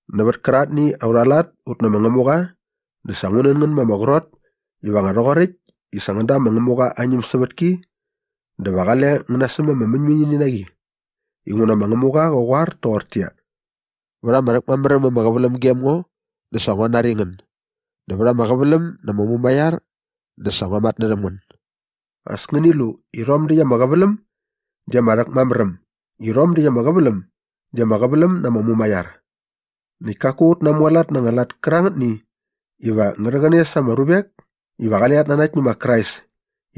Nävät kärangätni aurha lat ut nä ma Ngämuqa dä sa ngu nän ngän ma ama qrot iva nga rhoqoräkt i sa ngän da ma Ngämuqa aa ñämsävätki dä va qale ngän nasäm ama mäñmäñini na qi. Inguna ma Ngämuqa qa qoar toqortäqyia, “Vät ama rhäkmamär äm ama qäväläm gem ngo dä sa ngua nari ngän dä vät ama qäväläm na ama mumaiar dä sa ngua matnärhäm ngän.” As ngäni lu i rhom däkt ama qäväläm di ama rhäkmamär äm i rhom däkt ama qäväläm di ama qäväläm na ama mumaiar. Näkt kaku ut namualat na anga lat kärangätni iva ngä rhäqäne sa ama ruvek iva qale rhat nanakt nä ma Krais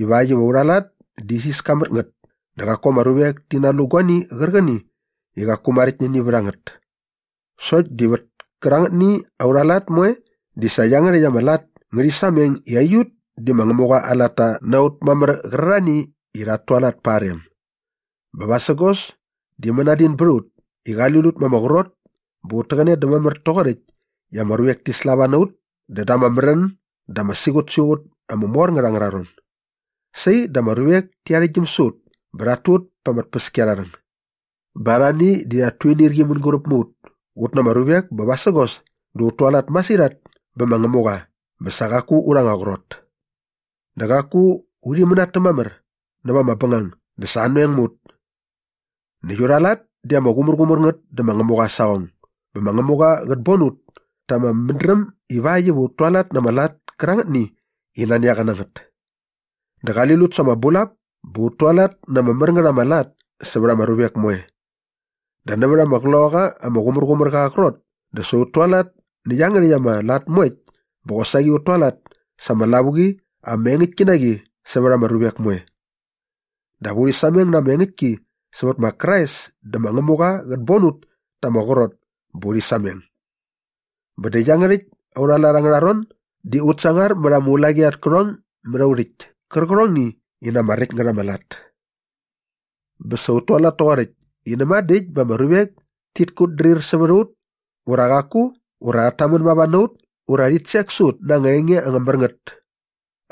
ivakt iva aurha lat di isiska mät ngät dä qaku ama ruvek ti nalu guani qärqäni i qaku maräkt nä ini vät a ngät. Sokt di vät kärangätni aurha lat moe di sa iangärhäkt ama lat ngärhi sameng i aiut di ma Ngämuqa aa latta na ut mamär qärarhani i rhat tualat pa aa rem. Bä vasägos di mänadin bät a ut i qali lut ma ama qrot bä ut täqäne dä mamär toqoräkt i ama ruvek ti slava na ut dä da ama märän dä ama siqutsiqut ama mor ngät angärha ron. Sai dä ama ruvek ti arhäktgyäm sä ut bä rhat tu ut pa ama tpäskiarharhäng. Bä arhani di rhat tuinirqi mänguräp mä ut ut na ama ruvek bä vasägos di ut tualat masirhat bä ma Ngämuqa bä sa qaku urha anga qrot. Dä qaku urhi mänatäm mamär näva ama bängang dä sa anoeng mä ut. Näkt aurha lat di ama qumärqumär ngät dä ma Ngämuqa aa saqong bä ma Ngämuqa qät bon ut ta ama mädräm ivakt iva ut tualat na ama lat kärangätni i nani a qa na ngät. Dä qali lut sa ama bulap bä ut tualat na ama mär ngät ama lat sävät ama ruvek moe. Dä nävät ama Qloqaqa ama Qumärqumärqa aa qrot di sa ut tualat nä iangärhäkt ama lat moekt bä qosaqi ut tualat sa ama lavuqi ama engäktki na qi sävät ama ruvek moe. Dap urhi sameng na ama engäktki sävät ma Krais dä ma Ngämuqa qät bon ut ta ama qrot bä urhi sameng. Bä dä iangärhäkt aurha lat angärha ron di ut sangar mät ama ulaqi at kärhong mät au rhäkt kärqärhongni i na ama räkt ngät ama lat. Bä sa ut tualat toqoräkt i näma dä äkt bä ama ruvek tit kutdrir sävät a ut ura qaku ura rhat tamän mava na ut ura rhit sek sä ut na anga enge ama mär ngät.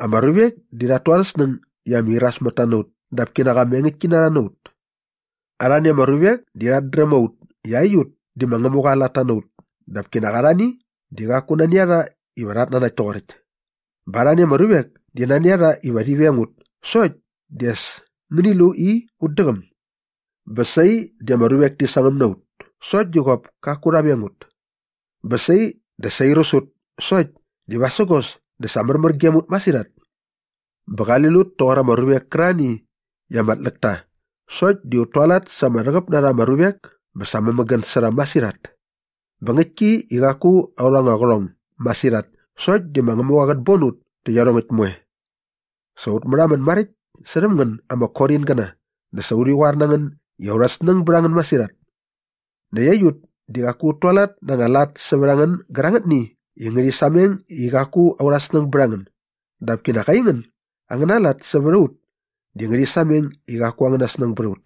Ama ruvek di rhat tu arhä snäng i ama irasmätta na ut dap kinak ama engäktkinarha na ut. Arhani ama ruvek di rhat dräm a ut i aiut di ma Ngämuqa aa latta na ut dap kinak arhani di qaku nani a rha iva rhat nanakt toqoräkt. Bä arhani ama ruvek di nani a rha iva rhi veng ut sokt di as ngäni lu i ut däqäm. Bä sai di ama ruvek ti sangäm na ut sokt di qop kaku rha veng ut. Bä sai dä sa airäs ut sokt di vasägos dä sa märmär gem ut masirhat. Bä qali lut toqor ama ruvek kärarhani i ama tläk ta sokt di ut tualat sa ama rhäqäp na rha ama ruvek bä sa mämägän sä rha masirhat. Bä ngäktki i qaku aurha anga qärhong masirhat sokt di ma Ngämuqa qät bon ut tä iarhongäkt moe. Sa ut märhamän maräkt särhäm ngän ama Koringäna dä sa urhi qoar na ngän i aurha snäng bät a ngän masirhat. Näkt aiut di qaku ut tualat na anga lat sävät a ngän gärangätni i ngärhi sameng i qaku aurha snäng bät a ngän dap kinak aingän angäna lat sävät a ut di ngärhi sameng i qaku angäna snäng bät a ut.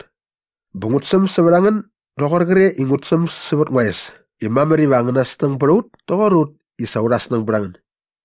Bä ngut säm sävät a ngän doqor qre i ngut säm sävät ngua es i mamär iva angäna snäng bät a ut toqor ut i sa urha snäng bät a ngän.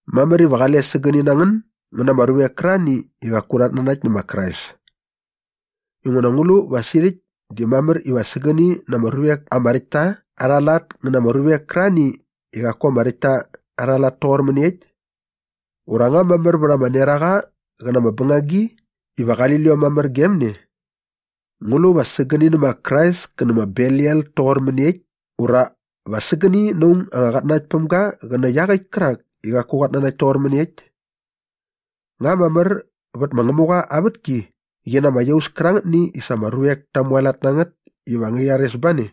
Mamär iva qale sägäni na ngän ngän na ama ruvek kärarhani i qaku rhat nanakt nä ma Krais. Inguna ngu lu va sirhäkt di mamär iva sägäni na ama ruvek ama räkt ta arha lat ngä na ama ruvek kärarhani i qaku ama räkt ta arha lat toqor mäniekt? Ura nga mamär vät ama neraqa qä na ama bängagi iva qali liom mamär gem ne? Ngu lu va sägäni nä ma Krais kä nä ma Belial toqor mäniekt ura va sägäni na aung anga qatnanaktpämga qä nä iaqäkt kärak i qaku qat nanakt toqor mäniekt? Nga mamär vät ma Ngämuqa aa vätki qi na ama iaus kärangätni i sa ama ruvek ta mualat na ngät iva ngärhi rhares ba ne?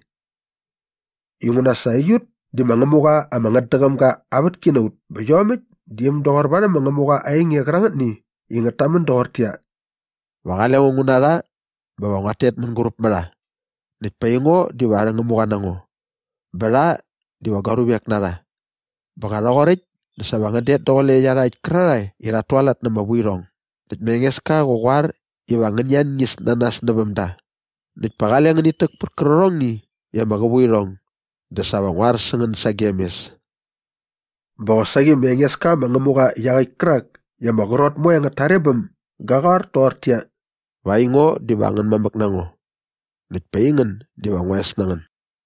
Inguna sa aiut di ma Ngämuqa ama ngätdäqäm ga aa vätki na ut bä iomäkt di äm doqor varhäm ma Ngämuqa aa enge qärangätni i ngät tamän doqortäqyia, “Va qale ngo ngu na rha bä va nguat tet mänguräp mä rha näkt pa aingo diva arhä Ngämuqa na ngo bä rha diva gua ruvek na rha. Bä nga rhoqoräkt dä sa va ngän det daqule iarhakt kärarhae i rhat tualat na ama vuirhong näkt ma Engeska qä qoar iva ngäni anñis na nas näväm da näkt pa qale ngänit täk pät kärqärhongni i ama qävu irhong dä sa va ngu ar sä ngän sagem mes.” Bä qosaqi ma Engeska ma Ngämuqa iaqäkt kärak i ama qrot moe angät tarebäm ga qoar toqortäqyia, “Va aingo diva angän mamäk na ngo näkt pa aingän diva ngua es na ngän.”